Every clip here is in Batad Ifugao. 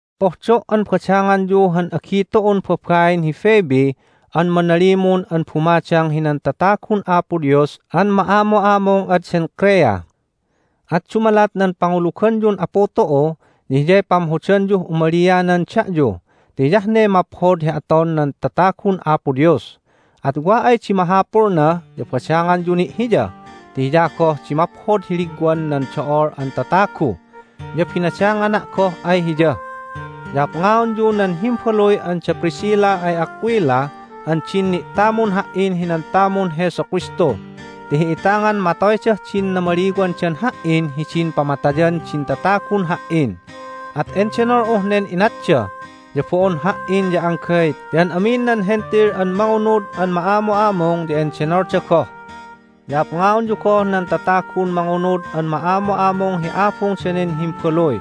Pohdo' an badanganyu han agi tu'un babain hi Phoebe an manalimun an bumadang hinan tatagun Apo Dios an ma'amu'amung ad Cenchrea. At dumalat nan panguluganyun Apu tu'u ya hiyay pamhodanyuh umalianan da'yu ti hiyah ne maphod hi aton nan tatagun Apo Dios. At wa ay di mahapulna ya badanganyu ni' hiya ti hiya goh di maphod hi ligwan nan do'ol an tatagu, ya binadangana' goh ay hiya. Ya apngaonyu nan himbaluy an da Priscilla ay Aquila an din ni'tamun ha"in hinan tamun Jesu Kristu ti hi'itangan matoydah din namaliwandan ha"in hidin pamatayan din tatagun ha"in. At endenol'uh nen inatda, ya bo'on ha"in ya anggay ti an amin nan Hentil an mangunud an ma'amu'amung ya endenolda goh. Ya apngaonyu goh nan tatagun mangunud an ma'amu'amung hi abung danen himbaluy.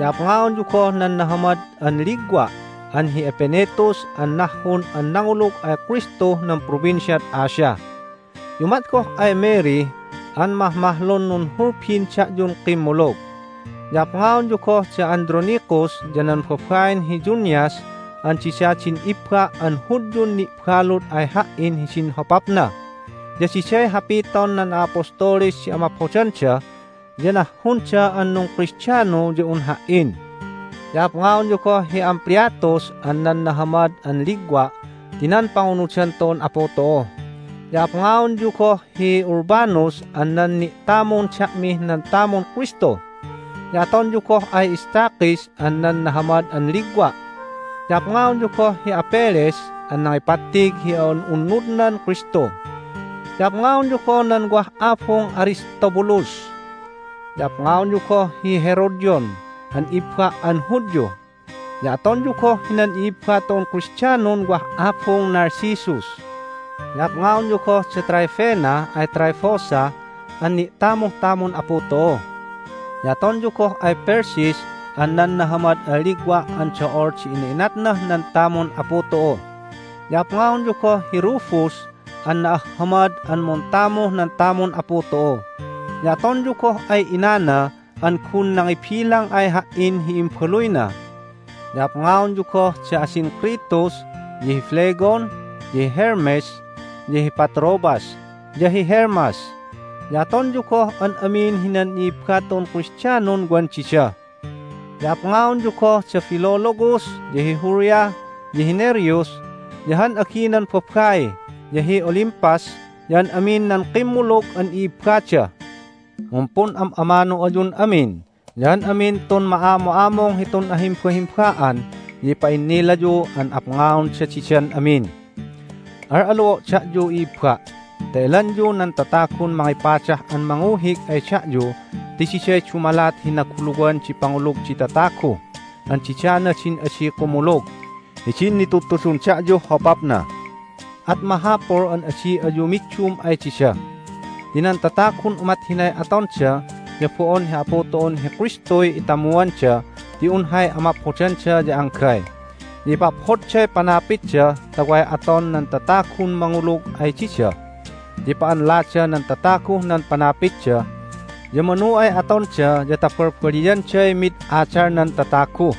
Ya apngaonyu goh nan nahamad an ligwa' an hi Epenetus an nahhun an nangulug ay Kristuh nan Provinciad Asia. Ya umat goh ay Mary an mahmahlun nunhulbin da'yun kimmulug. Ya apngaonyu goh da Andronicus ya nan babain hi Junias an dida din ibba' an Hudyun ni'balud ay ha"in hidin hopapna. Ya diday hapiton nan a'apostoles di amaphodanda, ya nahhunda an nungKristiano ya un ha"in. Ya apngaonyu goh hi Ampliatus an nan nahamad an ligwa' ti nan pangunudan tu'un Apu tu'u. Ya apngaonyu goh hi Urbanus an nan ni'tamun da'mih nan tamun Kristu. Ya atonyu goh ay Stachys an nan nahamad an ligwa'. Ya apngaonyu goh hi Apelles an nangipattig hi a'un'unnudnan Kristu. Ya apngaonyu goh nan wah abung Aristobulus. Ya apngaonyu goh hi Herodion an ibba' an Hudyu. Ya atonyu goh hinan i'ibba tu'un Kristianon wah abung Narcissus. Ya apngaonyu goh da Tryphena ay Tryphosa an ni'tamuh tamun Apu tu'u. Ya atonyu goh ay Persis an nan nahamad an ligwa' an do'ol di ina'inatnah nan tamun Apu tu'u. Ya apngaonyu goh hi Rufus an na'ahhamad an muntamuh nan tamun Apu tu'u. Ya atonyu goh ay inana an gun nangibilang ay ha"in hi imbaluyna. Ya apngaonyu goh da Asyncritus, ya hi Phlegon, ya hi Hermes, ya hi Patrobas, ya hi Hermas. Ya atonyu goh an amin hinan i'ibba tu'un Kristianon wan dida. Ya apngaonyu goh da Philologus, ya hi Julia, ya hi Nereus, ya han aginan babai, ya hi Olympas, ya an amin nan kimmulug an i'ibbada. Mumpun'am'amanu ayun amin. Ya an amin tun ma'amu'amung hitun ahimbahimba'an ya ipa'innilayu an apngaonda didan amin. Al'alu'o' da'yu, i'ibba', ta elanyu nan tatagun mangipadah an manguhig ay da'yu ti diday dumalat hi naguluwan di pangulug di tatagu, an didana din adi kumulug hidin nitudtudun da'yuh hopapna. At mahapul an adi ayu middum ay dida ti nan tatagun umat hinay atonda ya bo'on hi Apu tu'un hi Kristuy itamuanda ti un hay amaphodanda ya anggay. Ya ipaphodday panapitda ta way aton nan tatagun mangulug ay dida, ya ipa'anlada nan tataguh nan panapitda. Ya manu ay atonda ya ta balbaliyanday mid adalnan tatagu.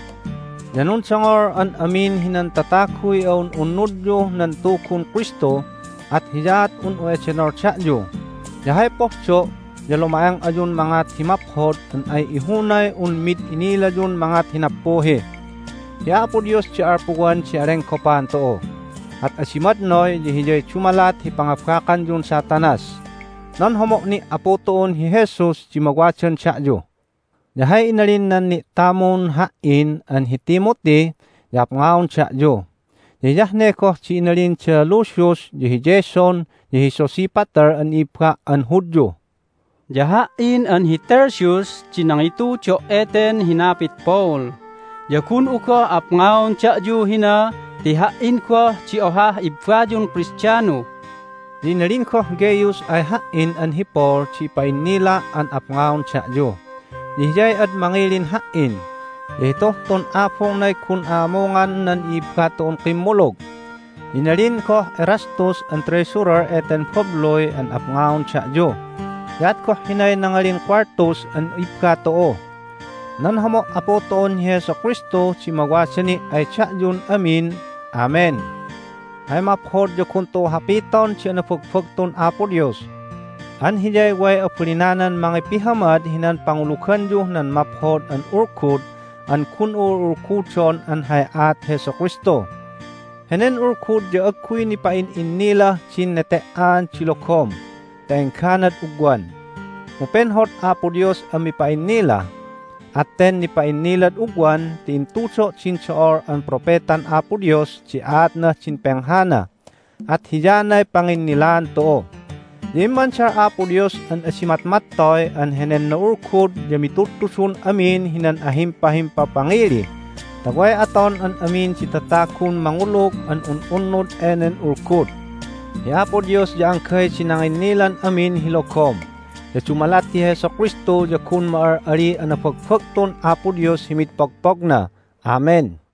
Ya nundongol an amin hinan tataguy a'un'unnudyuh nan Tugun Kristu, at hiyaat un'u edenol da'yu. Ya hay pohdo' ya luma'eng ayun mangat hi maphod an ay ihunay un mid inilayun mangat hi nappuhi. Hi Apo Dios di alpuwan di alenggopan tu'u. At adi madnoy ya Hiyay dumalat hi pangabakanyun Satanas. Nan homo' ni' Apu tu'un hi Jesus di mawadan da'yu. Ya hay inalin nan ni'tamun ha"in an hi Timothy ya apngaon da'yu. Ya hiyah ne goh di inalin da Lucius, ya hi Jason, ya hi Sosipater an i'ibba' an Hudyu. Ya ha"in an hi Tertius di nangitudo' eten hinapit Paul, ya gun'u goh apngaon da'yu hina ti ha"in goh di ohah ibbayun Kristiano. Ya inalin goh Gaius ay ha"in an hi Paul di ipa'innila' an apngaon da'yu. Ya hiyay ad mangilin ha"in, ya hituh tun abungnay gun a'amungan nan i'ibba tu'un kimmulug. Ya inalin goh Erastus an treasurer eten babluy an apngaon da'yu. Ya at goh hinay nangalin Quartus an ibba tu'u. Nan homo' Apu tu'un hi Jesu Kristu di mawada ni' ay da'yun amin. Amen! Hay maphod ya gun tu'u hapiton di anabagbagtun Apo Dios! An Hiyay way abalinanan mangipihamad hinan panguluganyuh nan Maphod an Ulgud an gun'u ul'ulgudon an hay aat Jesu Kristu. Henen Ulgud ya agguy nipa'in'innilah din nete"an di logom ta engganad ugwan, mu penhod Apo Dios an mipa'innila. At ten nipa'innilad ugwan ti intudo' din do'ol an propetan Apo Dios di aatnah din penghana, at hiyanay panginnilaan tu'u. Ya immandal Apo Dios an adi matmattoy an henen na'ulgud ya mitudtudun amin hinan ahimpahimpapangili ta way aton an amin di tatagun mangulug an un'unnud enen Ulgud. Hi Apo Dios ya anggay di nanginnilan amin hi logom! Ya dumalat hi Jesu Kristu ya gun ma'al'aliy anabagbagtun Apo Dios hi mid pogpogna! Amen!